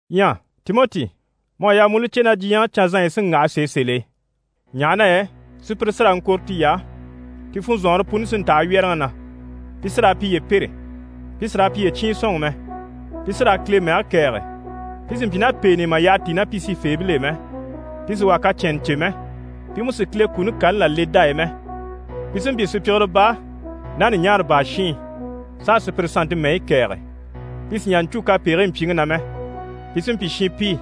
Ɲyɛ Timɔti, mu à yaa mu u li cè na diɲyɛŋi canzanɲyi sí n‑waha sèe sèl'e, ɲaha na yɛ sùpyire sí raa n‑kɔ̀re tiy'á, ti funzɔnŋɔre puni sí n‑taha wyɛ́rɛŋi na, pi sí raa piye pêre, pi sì raa piye cyiin sɔ̂nŋɔ mɛ, pi sí raa Kile mɛge kɛ̀ɛge, pi sì n‑pyi ná pèen'i mà yaha tíi ná pi sifeebil'e mɛ, pi sì wà kacɛnnɛ cè mɛ, pi mú sì Kile kuni kani là le dá e mɛ. Pi sí n‑pyi sùpyigire baa ná ɲùɲaara baa shiin, s'a sùpyire sannte mɛyi kɛ̀ɛge, pi sì n‑jà n‑cû kapegigii mpyiŋi na mɛ, pi sí n‑pyi shinpii,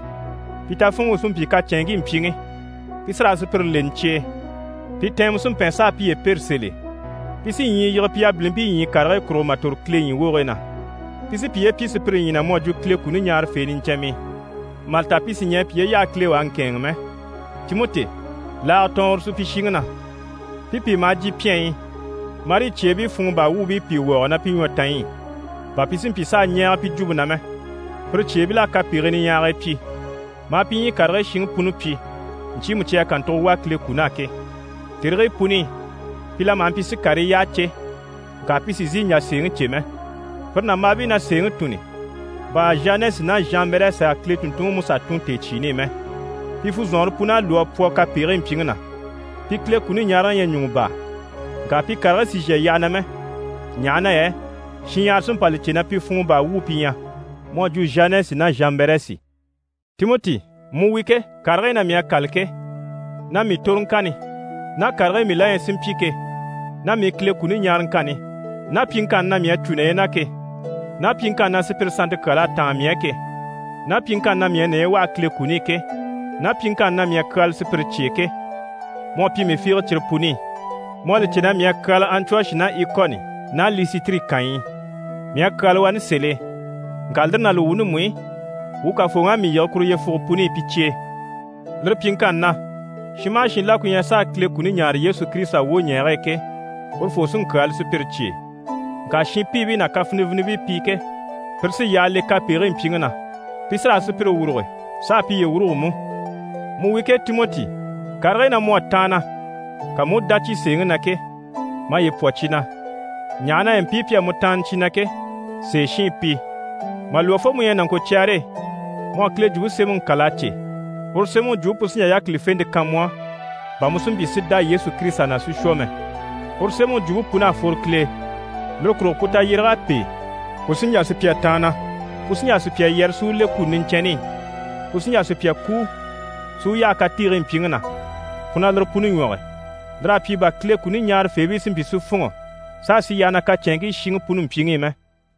pi tafunŋi u sí n‑pyi kacɛnŋkii mpyiŋi. Pi sí raa sùpyire leni cye e, pi tɛɛnmɛ sí n‑pɛn, s'a piye pêre sèl'e. Pi sí ɲyii yige pi yabilimpii ɲyii karigii kurugo mà tòro Kile ɲyii wogigii na. Pi sí piye pyi sùpyire ɲyii na, mu à jwo Kile kuni ɲaarafee niɲcɛnmii, mà li ta pi sì ɲɛɛ piye yaha Kile u a ŋkɛ̂ɛnŋi mɛ. Timɔti, laaga tɔɔn uru supyishiŋi na. Pi pìi maha jyè pyɛnyi i marii cyeebii funŋɔ baa wuubii pìi wɔɔge ná pi ɲwɔtanyi i, bà pi si mpyi s'a ɲɛɛge pi jwumpe na mɛ. Pire cyeebil'à kapegigii niɲyahagii pyi, maa pi ɲyii karigii shiŋi puni pyi ɲcyiimu cyi à kàntugo wà Kile kun'á ke. Tèrigii puni i, pi la maha mpyi si karii yyaha cè, ŋka pi sì n‑sìi n‑jà sèeŋi cè mɛ. Pire nàmbaabii na sèeŋi tùnni, bà Zhanɛsi ná Zhanbɛrɛsi à Kile tùnntunŋiMusa tùn tèecyiini i mɛ. Pi funzɔnŋɔre pun'à lwɔ́ a pwɔ kapegigii mpyiŋi na, pi Kile kuni ɲaaraŋi ɲyɛ ɲùŋɔ baa. Ŋka pi karigii sì n‑shà yyaha na mɛ, ɲaha na yɛ shinɲyahara sí n‑pa li cè na pi funŋɔ baa wuu pi ɲyɛ, mu à jwo Zhanɛsi ná Zhanbɛrɛsi. Timɔti, mu wi ke, karigii na mii à kâla ke, ná mii toroŋkanni ná karigii mii la ɲyɛ si mpyi ke, ná mii Kile kuni ɲaaraŋkanni ná pyiŋkanni na mii à cû naye ke, ná pyiŋkanni na sùpyire sannte kyal'à táan mii á ke, ná pyiŋkanni na mii à naye waha Kile kuni i ke, ná pyiŋkanni na mii à kyaala sùpyire cye e ke, mu à pyi mii fiige cyire puni i. Mu à li cè na mii à kyaala Antiyɔshi ná Ikoni ná Lisitiri kànyi i. Mii à kyaala wani sèl'e, ŋka lire ná li wuuni mú i, wuu Kafooŋi à mii yige kuru yyefuge puni i pi cye e. Lire pyiŋkanni na, shin maha shin la ku ɲyɛ s'a Kile kuni ɲaare Yesu Kirisita wwoɲɛɛge e ke, urufoo sí n‑kyaala sùpyire cye e. Ŋka shinpiibii ná kafinivinibii pi ke, pire sí yyaha le kapegigii mpyiŋi na, pi sí raa sùpyire wuruge s'a piye wuruge mú. Mu wi ke Timɔti, karigii na mu à taanna, ka mu u dá cyi sèeŋi na ke, maye pwɔ cyi na, ɲaha na yɛ mpii pi à mu taanna cyi na ke, sèeshiin pi. Mà lwɔ́ fo mu ɲyɛ nàŋkocyɛɛre e, mu à Kile Jwumpe Semɛŋi kâla a cè, uru Semɛŋi jwumpe pu sí n‑jà yákilifente kan mu á, bà mu si mpyi si dá Yesu Kirisita na si shwɔ mɛ. Uru Semɛŋi jwumpe pun'à fworo Kile e, lire kurugo pu tayyéreg'à pêe, pu sí n‑jà sùpya taanna, pu sí n‑jà sùpya yɛrɛ si u le kuni niɲcɛnni i, pu sí n‑jà sùpyaŋi kúu, si u yaha katiigii mpyiŋi na, pu na lire puni ɲwɔge. Lir'à pyi bà Kile kuni ɲaarafeebii si mpyi si fûnŋɔ s'a sì yyaha na kacɛnŋkii shiŋi puni mpyiŋi i mɛ.